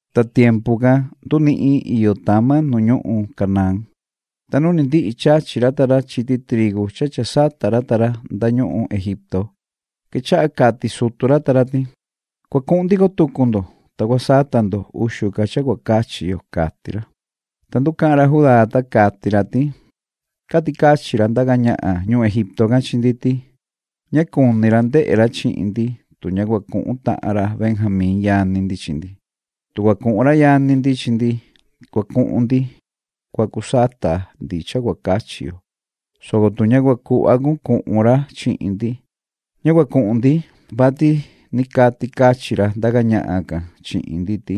Ta tiempu can ndunihin iyo tama nu ñuhun Canaán, ta nu ndihi chachi ra ta ra chiti trigu cha cha sata ra ta ra nda ñuhun Egipto, quechaha cati sutu ra ta ra ti: ―Cua cuhun ndico tucu ndo, ta cua sata ndo uxu ca cha cua cachi yo ―cati ra. Ta nducahan ra Judá, ta cati ra ti: ―Cati cachin ra ndaca ñahan ñuhun Egipto can chi ndi ti: ‘Ña cuni ra ndehe ra chihin ndi, tu ña cua cuhun tahan ra Benjamín yani ndi chi ndi’. Tu cua cuhun ra yani ndi chi ndi, cua cuhun ndi cua cu sata ndi cha cua cachi yo, soco tu ña cua cuhva cun cuhun ra chihin ndi, ña cua cuhun ndi, vati ni cati cachin ra ndaca ñahan can chihin ndi ti: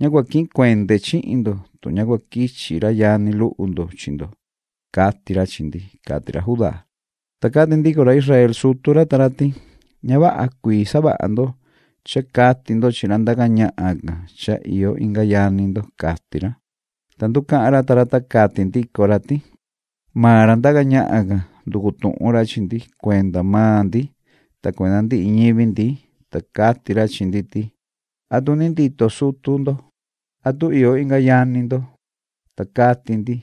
‘Ña cua quihin cuende chihin ndo, tu ña cua quichi ra yani luhu ndo chi ndo’, cati ra chi ndi ―cati ra Judá. Ta cati ndico ra Israel sutu ra ta ra ti: ―Ña vaha cuii savaha ndo cha cati ndo chi ra ndaca ñahan can cha iyo inga yani ndo ―cati ra. Ta nducahan ra ta ra, ta cati ndico ra ti: ―Maan ra ndaca ñahan can, nducu tuhun ra chi ndi cuenda maan ndi ta cuenda ndihi ñivi ndi, ta cati ra chi ndi ti: ‘¿Atu ni iyo ndito sutu ndo? ¿Atu iyo inga yani ndo?’ Ta cati ndi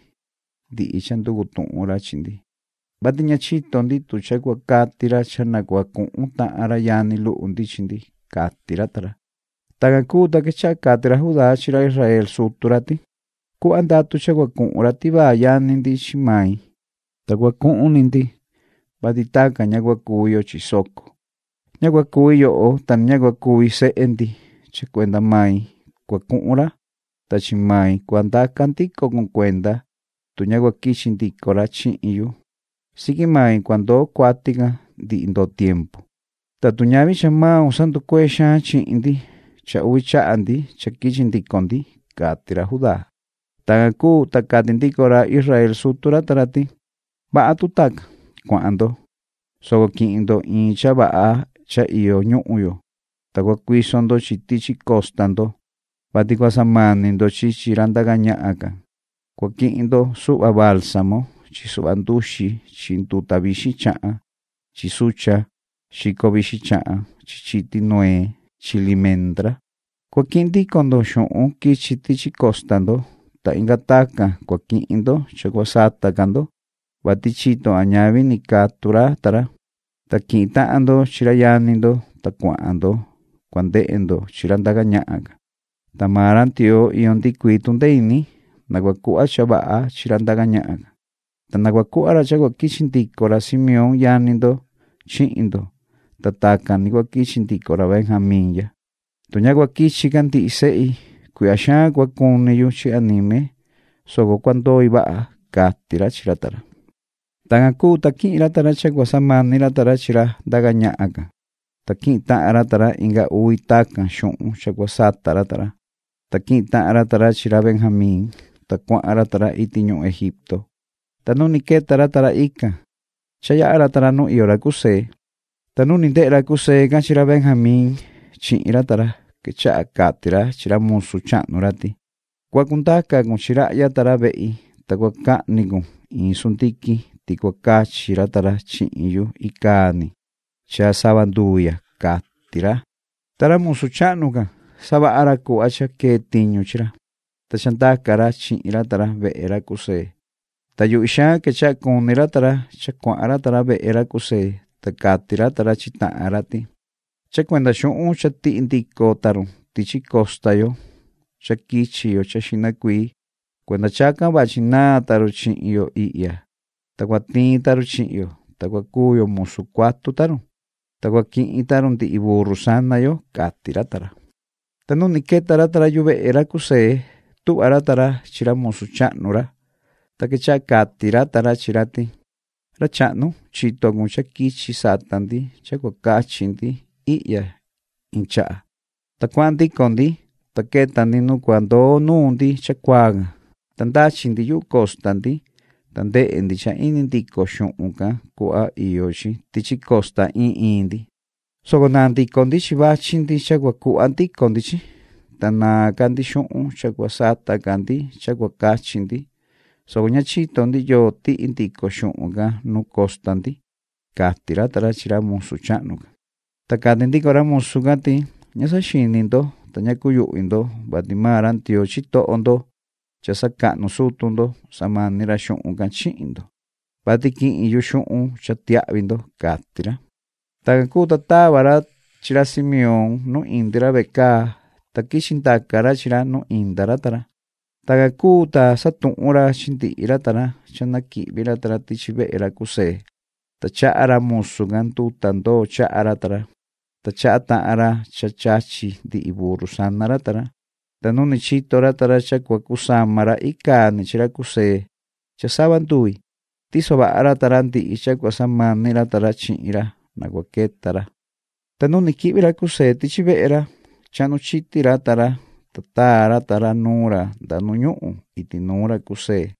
ndihi cha nducu tuhun ra chi ndi, vati ña chito ndi tu cha cua cati ra cha na cua cuhun tahan ra yani luhu ndi chi ndi ―cati ra ta ra. Tacan cuu, ta quechaha cati ra Judá chi ra Israel sutu ra ti: ―Cuhva ndatu cha na cua cuhun ra tivaa yani ndi chi mai, ta cua cuhun ni ndi, vati tacan ña cua cuvi yo chi soco. Ña cua cuvi yoho, ta ni ña cua cuvi sehe ndi. Cha cuenda mai cua cuhun ra, ta chi mai cua ndaca ndico cun cuenda. Tu ña cua quichi ndico ra chihin yu, siqui mai cua ndoo cuati can ndihi ndoo tiempu. Ta tu ñavi cha maun sanducuee xaan chihin ndi, cha uvi chaha ndi cha quichi ndico ndi ―cati ra Judá. Tacan cuu, ta cati ndico ra Israel sutu ra ta ra ti: ―Vaha tu tacan. Cuahan ndo, soco quihin ndo iin cha vaha cha iyo ñuhun yo, ta cua cuiso ndo chi tichi costa ndo, vati cua samani ndo chi chi ra ndaca ñahan can. Cua quihin ndo suhva baalsamo chi suhva nduxi chi nduta vixin chahan chi suchan xico vixin chahan chi chiti nuee chi limendra. Cua quihin ndico ndo xuhun quichi tichi costa ndo, ta inga tacan cua quihin ndo cha cua sata ca ndo, vati chito a ñavi ni catu ra ta ra. Ta quihin tahan ndo chi ra yani ndo, ta cuahan ndo cua ndehe ndo chi ra ndaca ñahan can. Ta maan ra Ndioo iyo ndihi cuii tundee ini, na cua cuhva cha vaha chi ra ndaca ñahan can, ta na cua cuhva ra cha cua quichi ndico ra Simeón yani ndo chihin ndo, ta tacan ni cua quichi ndico ra Benjamín ya. Tu ña cua quichi ca ndihi sehi, cuihya xaan ca cua cuni yu chi anime, soco cua ndoi vaha ―cati ra chi ra ta ra. Tacan cuu, ta quihin ra ta ra cha cua samani ra ta ra chi ra ndaca ñahan can, ta quihin tahan ra ta ra inga uvi tacan xuhun cha cua sata ra ta ra, ta quihin tahan ra ta ra chi ra Benjamín, ta cuahan ra ta ra iti ñuhun Egipto. Ta nu ni queta ra ta ra ican, cha yaha ra ta ra nu iyo ra José. Ta nu ni ndehe ra José can chi ra Benjamín chihin ra ta ra, quechaha cati ra chi ra musu chahnu ra ti: ―Cua cundaca cun chi rahya ta ra vehi, ta cua cahni cun iin sundiquin ti cua cachi ra ta ra chihin yu icaa ni cha sava nduvi ya ―cati ra. Ta ra musu chahnu can, savaha ra cuhva cha quee tiñu chi ra, ta cha ndaca ra chihin ra ta ra vehe ra José. Ta yuhvi xaan quechaha cuni ra ta ra cha cuahan ra ta ra vehe ra José. Ta cati ra ta ra chi tahan ra ti: ―Cha cuenda xuhun cha tihi ndico ta run tichi costa yo cha quichi yo cha xihna cuii, cuenda chacan vachi naan ta run chihin yo ihya, ta cua tiin ta run chihin yo, ta cua cuu yo musu cuatu ta run, ta cua quihin ta run ndihi burru sana yo ―cati ra ta ra. Ta nu ni queta ra ta ra yuvehe ra José, tuhva ra ta ra chi ra musu chahnu ra. Ta quechaha cati ra ta ra chi ra ti: ―Ra chahnu, chito cun cha quichi sata ndi cha cua cachi ndi ihya iin chaha, ta cuahan ndico ndi. Ta queta ndi nu cua ndoo nuun ndi chacuaa can, ta ndachi ndi yuhu costa ndi, ta ndehe ndi cha indi ndico xuhun can cuhva iyo chi tichi costa iin iin ndi, soco naan ndico ndi chi vachi ndi cha cua cuhva ndico ndi chi. Ta naan ca ndi xuhun cha cua sata ca ndi cha cua cachi ndi, soco ña chito ndi yoo tihi ndico xuhun can nu costa ndi ―cati ra ta ra chi ra musu chahnu can. Ta cati ndico ra musu can ti: ―Ña saxini ndo, ta ña cuyuhvi ndo, vati maan ra Ndioo ndo cha sacahnu sutu ndo, samani ra xuhun can chihin ndo, vati quihin yu xuhun cha tiahvi ndo ―cati ra. Tacan cuu, ta tava ra chi ra Simeón nu indi ra vecaa, ta quichi ndaca ra chi ra nu inda ra ta ra. Tacan cuu, ta satuhun ra chi ndihi ra ta ra cha na quihvi ra ta ra tichi vehe ra José, ta chaha ra musu can nduta ndoo chaha ra ta ra, ta chaha tahan ra cha chachi ndihi burru sana ra ta ra. Ta nu ni chito ra ta ra cha cua cusama ra icaa ni chi ra José cha sava nduvi, tiso vaha ra ta ra ndihi cha cua samani ra ta ra chihin ra na cua queta ra. Ta nu ni quihvi ra José tichi vehe ra, chahnu chiti ra ta ra, ta taa ra ta ra nuun ra nda nu ñuhun iti nuun ra José.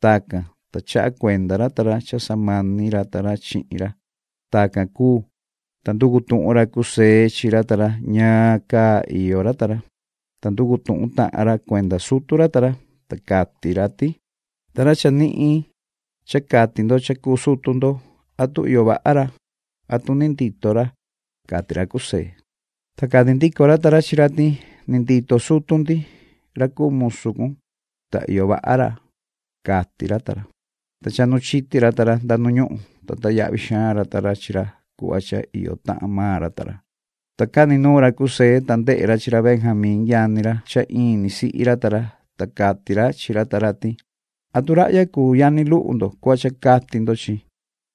Tacan, ta chaha cuenda ra ta ra cha samani ra ta ra chihin ra. Tacan cuu, ta nducu tuhun ra José chi ra ta ra ñaan caa iyo ra ta ra, ta nducu tuhun tahan ra cuenda sutu ra ta ra, ta cati ra ti: ―Ta ra chanihin cha cati ndo cha cuu sutu ndo, ¿atu iyo vaha ra? ¿atu ni ndito ra? ―cati ra José. Ta cati ndico ra ta ra chi ra ti: ―Ni ndito sutu ndi ra cuu musu cun, ta iyo vaha ra ―cati ra ta ra. Ta chahnu chiti ra ta ra nda nu ñuhun, ta tayahvi xaan ra ta ra chi ra cuhva cha iyo tahan maan ra ta ra. Ta cani nuun ra José, ta ndehe ra chi ra Benjamín yani ra cha in ni sihi ra ta ra, ta cati ra chi ra ta ra ti: ―¿Atu rahya cuu yani luhu ndo cuhva cha cati ndo chi?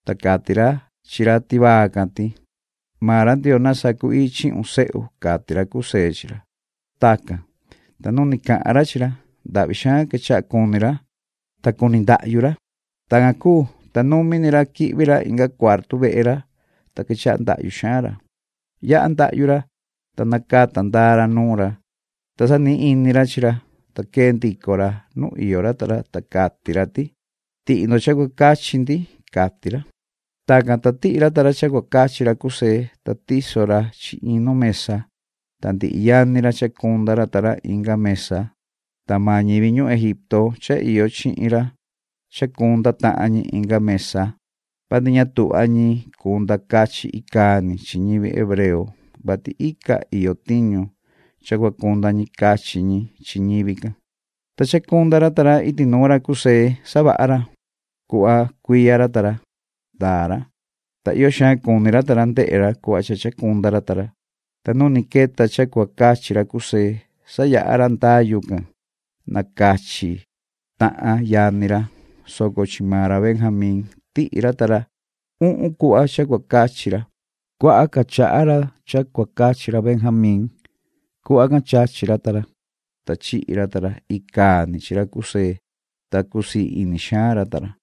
Ta cati ra chi ra tivaa can ti: ¡Maan ra Ndioo na sacu-ii chihun, sehu! ―cati ra José chi ra. Tacan, ta nu ni cati ra chi ra, ndahvi xaan quechaha cuni ra, ta cuni ndahyu ra. Tacan cuu, ta numi ni ra quihvi ra inga cuartu vehe ra, ta quechaha ndahyu xaan ra. Yaha ndahyu ra, ta nacata ndaa ra nuun ra, ta sanihin ini ra chi ra, ta quee ndico ra nu iyo ra ta ra, ta cati ra ti: “Tihi ndo cha cua cachi ndi”, cati ra. Tacan, ta tihi ra ta ra cha cua cachi ra José, ta tiso ra chi iin nu mesa, ta ndihi yani ra chacunda ra ta ra inga mesa, ta maan ñivi ñuhun Egipto cha iyo chihin ra chacunda tahan ñi inga mesa, vati ña tuhva ñi cunda cachi icaa ni chi ñivi hebreo, vati ica iyo tiñu cha cua cunda ñi cachi ñi chi ñivi can. Ta chacunda ra ta ra iti nuun ra José savaha ra. Cuhva cuiya ra ta ra ndaa ra, ta iyo xaan cuni ra ta ra ndehe ra cuhva cha ndaa tahan ra ta ra. Ta nu ni queta cha cua cachi ra José, sayaha ra ndayu can na cachi tahan yani ra, soco chi maan ra Benjamín tihi ra ta ra uhun cuhva cha cua cachi ra. Cuaha ca chaha ra cha cua cachi ra Benjamín. Cuhva can chachi ra ta ra, ta chihi ra ta ra icaa ni chi ra José, ta cusii ini xaan ra ta ra.